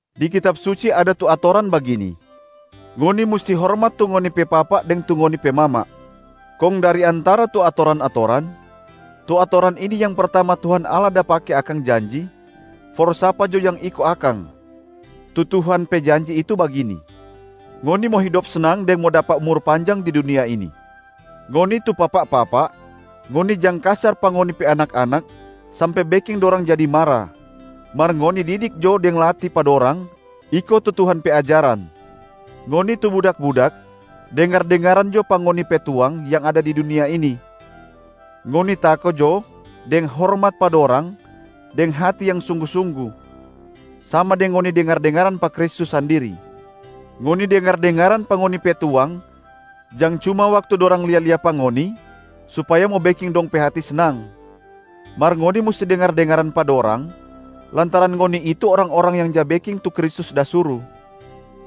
Di Kitab Suci ada tu atoran bagini, “Ngoni musti hormat tu ngoni pe papa deng tu ngoni pe mama.” Kong dari antara tu atoran-atoran, tu atoran ini yang pertama Tuhan Allah da pake akang janji for sapa jo yang iko akang. Tu Tuhan pe janji itu bagini, “Ngoni mo hidop snang deng mo dapa umur panjang di dunia ini.” Ngoni tu papa-papa, ngoni jang kasar pa ngoni pe anak-anak sampe beking dorang jadi mara, mar ngoni didik jo deng latih pa dorang iko tu Tuhan pe ajaran. Ngoni tu budak-budak, dengar-dengaran jo pa ngoni pe tuang yang ada di dunia ini. Ngoni tako jo deng hormat pa dorang deng hati yang sunggu-sunggu, sama deng ngoni dengar-dengaran pa Kristus sandiri. Ngoni dengar-dengaran pa ngoni pe tuang jang cuma waktu dorang lia-lia pa ngoni supaya mo beking dong pe hati snang. Mar ngoni musti dengar-dengaran pa dorang lantaran ngoni itu orang-orang yang ja beking tu Kristus da suru,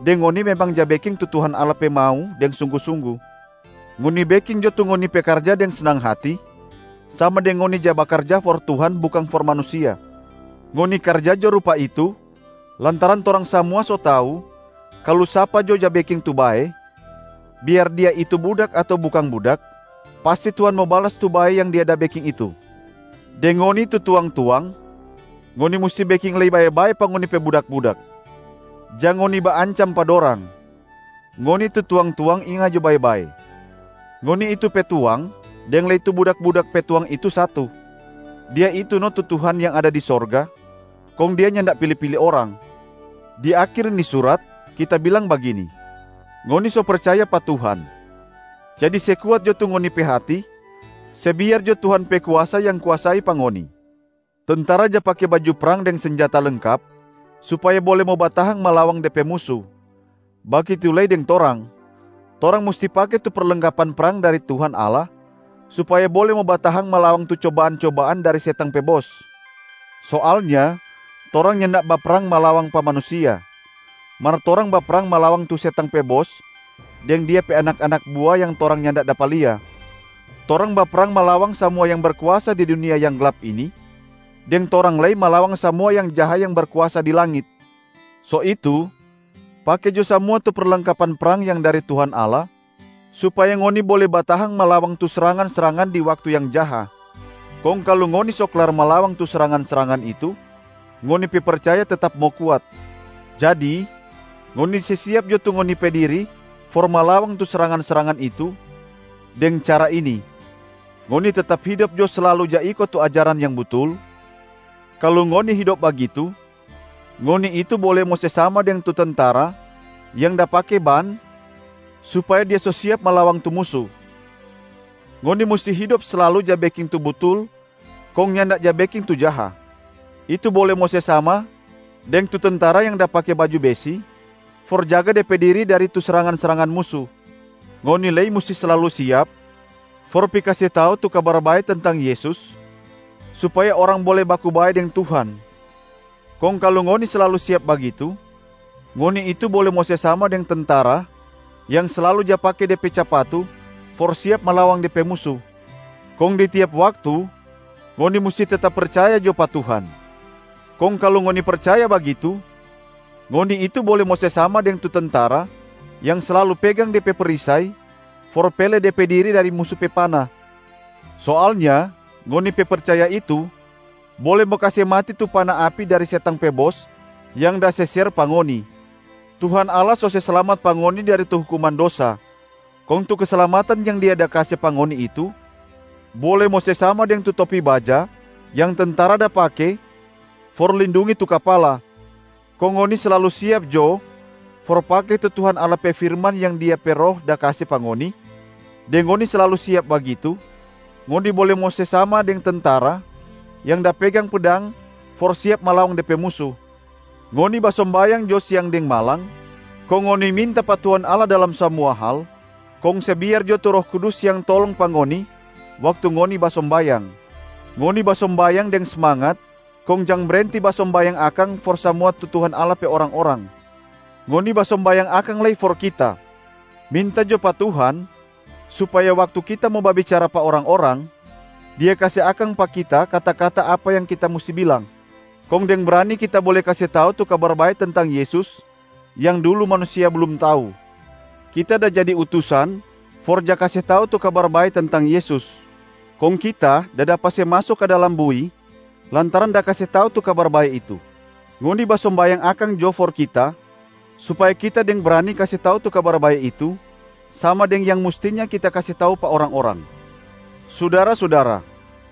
deng ngoni memang ja beking tu Tuhan Allah pe mau deng sunggu-sunggu. Ngoni beking jo tu ngoni pe karja deng snang hati, sama deng ngoni ja bakarja for Tuhan bukang for manusia. Ngoni karja jo rupa itu lantaran torang samua so tau kalu sapa jo ja beking tu bae, biar dia itu budak ato bukang budak, pasti Tuhan mo balas tu bae yang dia da beking itu. Deng ngoni tu tuang-tuang, ngoni musti beking lei bae-bae pa ngoni pe budak-budak. Jang ngoni baancam pa dorang. Ngoni tu tuang-tuang inga jo bae-bae: ngoni itu pe Tuang, deng lei tu budak-budak pe Tuang itu satu, Dia itu no tu Tuhan yang ada di sorga, kong Dia nyanda pili-pili orang. Di akhir ni surat, kita bilang bagini: ngoni so percaya pa Tuhan, jadi se kuat jo tu ngoni pe hati, se biar jo Tuhan pe kuasa yang kuasai pa ngoni. Tentara ja pake baju prang deng senjata lengkap supaya bole mo batahang malawang de pe musu, bagitu lei deng torang, torang musti pake tu perlengkapan prang dari Tuhan Allah supaya bole mo batahang malawang tu cobaan-cobaan dari setang pe bos. Soalnya torang nyanda baprang malawang pa manusia, mar torang baprang malawang tu setang pe bos deng dia pe anak-anak bua yang torang nyanda dapa lia. Torang baprang malawang samua yang berkuasa di dunia yang glap ini, deng torang lei malawang samua yang jaha yang berkuasa di langit. So itu pake jo samua tu perlengkapan prang yang dari Tuhan Allah supaya ngoni bole batahang malawang tu srangan-srangan di waktu yang jaha. Kong kalu ngoni so klar malawang tu srangan-srangan itu, ngoni pe percaya tetap mo kuat. Jadi ngoni se siap jo tu ngoni pe diri for malawang tu srangan-srangan itu deng cara ini: ngoni tetap hidop jo slalu ja iko tu ajaran yang butul, kalu ngoni hidop bagitu, ngoni itu bole mo se sama deng tu tentara yang da pake ban supaya dia so siap malawang tu musu. Ngoni musti hidop slalu ja beking tu butul kong nyanda ja beking tu jaha, itu bole mo se sama deng tu tentara yang da pake baju besi for jaga de pe diri dari tu srangan-srangan musu. Ngoni lei musti slalu siap for pi kase tau tu Kabar Bae tentang Yesus supaya orang bole baku bae deng Tuhan, kong kalu ngoni slalu siap bagitu, ngoni itu bole mo se sama deng tentara yang slalu ja pake de pe capatu for siap malawang de pe musu. Kong di tiap waktu ngoni musti tetap percaya jo pa Tuhan, kong kalu ngoni percaya bagitu, ngoni itu bole mo se sama deng tu tentara yang slalu pegang de pe perisai for pele de pe diri dari musu pe pana. Soalnya ngoni pe percaya itu bole mo kase mati tu pana api dari setang pe bos yang da se ser pa ngoni. Tuhan Allah so se slamat pa ngoni dari tu hukuman dosa, kong tu keslamatan yang Dia da kase pa ngoni itu bole mo se sama deng tu topi baja yang tentara da pake for lindungi tu kapala. Kong ngoni slalu siap jo for pake tu Tuhan Allah pe firman yang Dia pe Roh da kase pa ngoni, deng ngoni slalu siap bagitu, ngoni bole mo se sama deng tentara yang da pegang pedang for siap malawang de pe musu. Ngoni basombayang jo siang deng malam, kong ngoni minta pa Tuhan Allah dalam samua hal, kong se biar jo tu Roh Kudus yang tolong pa ngoni waktu ngoni basombayang. Ngoni basombayang deng smangat kong jang brenti basombayang akang for samua tu Tuhan Allah pe orang-orang. Ngoni basombayang akang lei for kita. Minta jo pa Tuhan supaya waktu kita mo babicara pa orang-orang, Dia kase akang pa kita kata-kata apa yang kita musti bilang, kong deng brani kita bole kase tau tu Kabar Bae tentang Yesus yang dulu manusia blum tau. Kita da jadi utusan for ja kase tau tu Kabar Bae tentang Yesus, kong kita da dapa se maso ka dalam bui lantaran da kase tau tu Kabar Bae itu. Ngoni basombayang akang jo for kita supaya kita deng brani kase tau tu Kabar Bae itu, sama deng yang mustinya kita kase tau pa orang-orang. Sudara-sudara,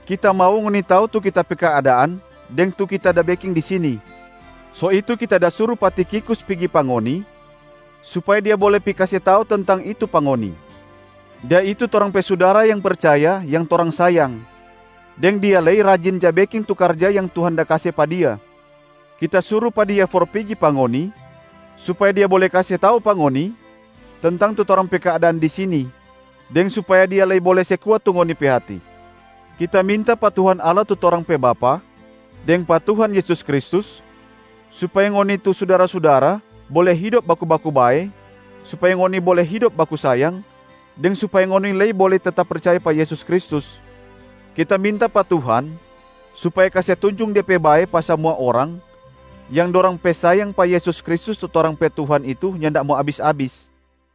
kita mau ngoni tau tu kita pe keadaan deng tu kita da beking di sini, so itu kita da suru pa Tikhikus pigi pa ngoni supaya dia bole pi kase tau tentang itu pa ngoni. Dia itu torang pe sudara yang percaya yang torang sayang, deng dia lei rajin ja beking tu karja yang Tuhan da kase pa dia. Kita suru pa dia for pigi pa ngoni supaya dia bole kase tau pa ngoni tentang tu torang pe keadaan di sini, deng supaya dia lei bole se kuat tu ngoni pe hati. Kita minta pa Tuhan Allah tu torang pe Bapa, deng pa Tuhan Yesus Kristus, supaya ngoni tu sudara-sudara bole hidop baku-baku bae, supaya ngoni bole hidop baku sayang, deng supaya ngoni lei bole tetap percaya pa Yesus Kristus. Kita minta pa Tuhan supaya kase tunjung De pe bae pa samua orang yang dorang pe sayang pa Yesus Kristus tu torang pe Tuhan itu nyanda mo abis-abis.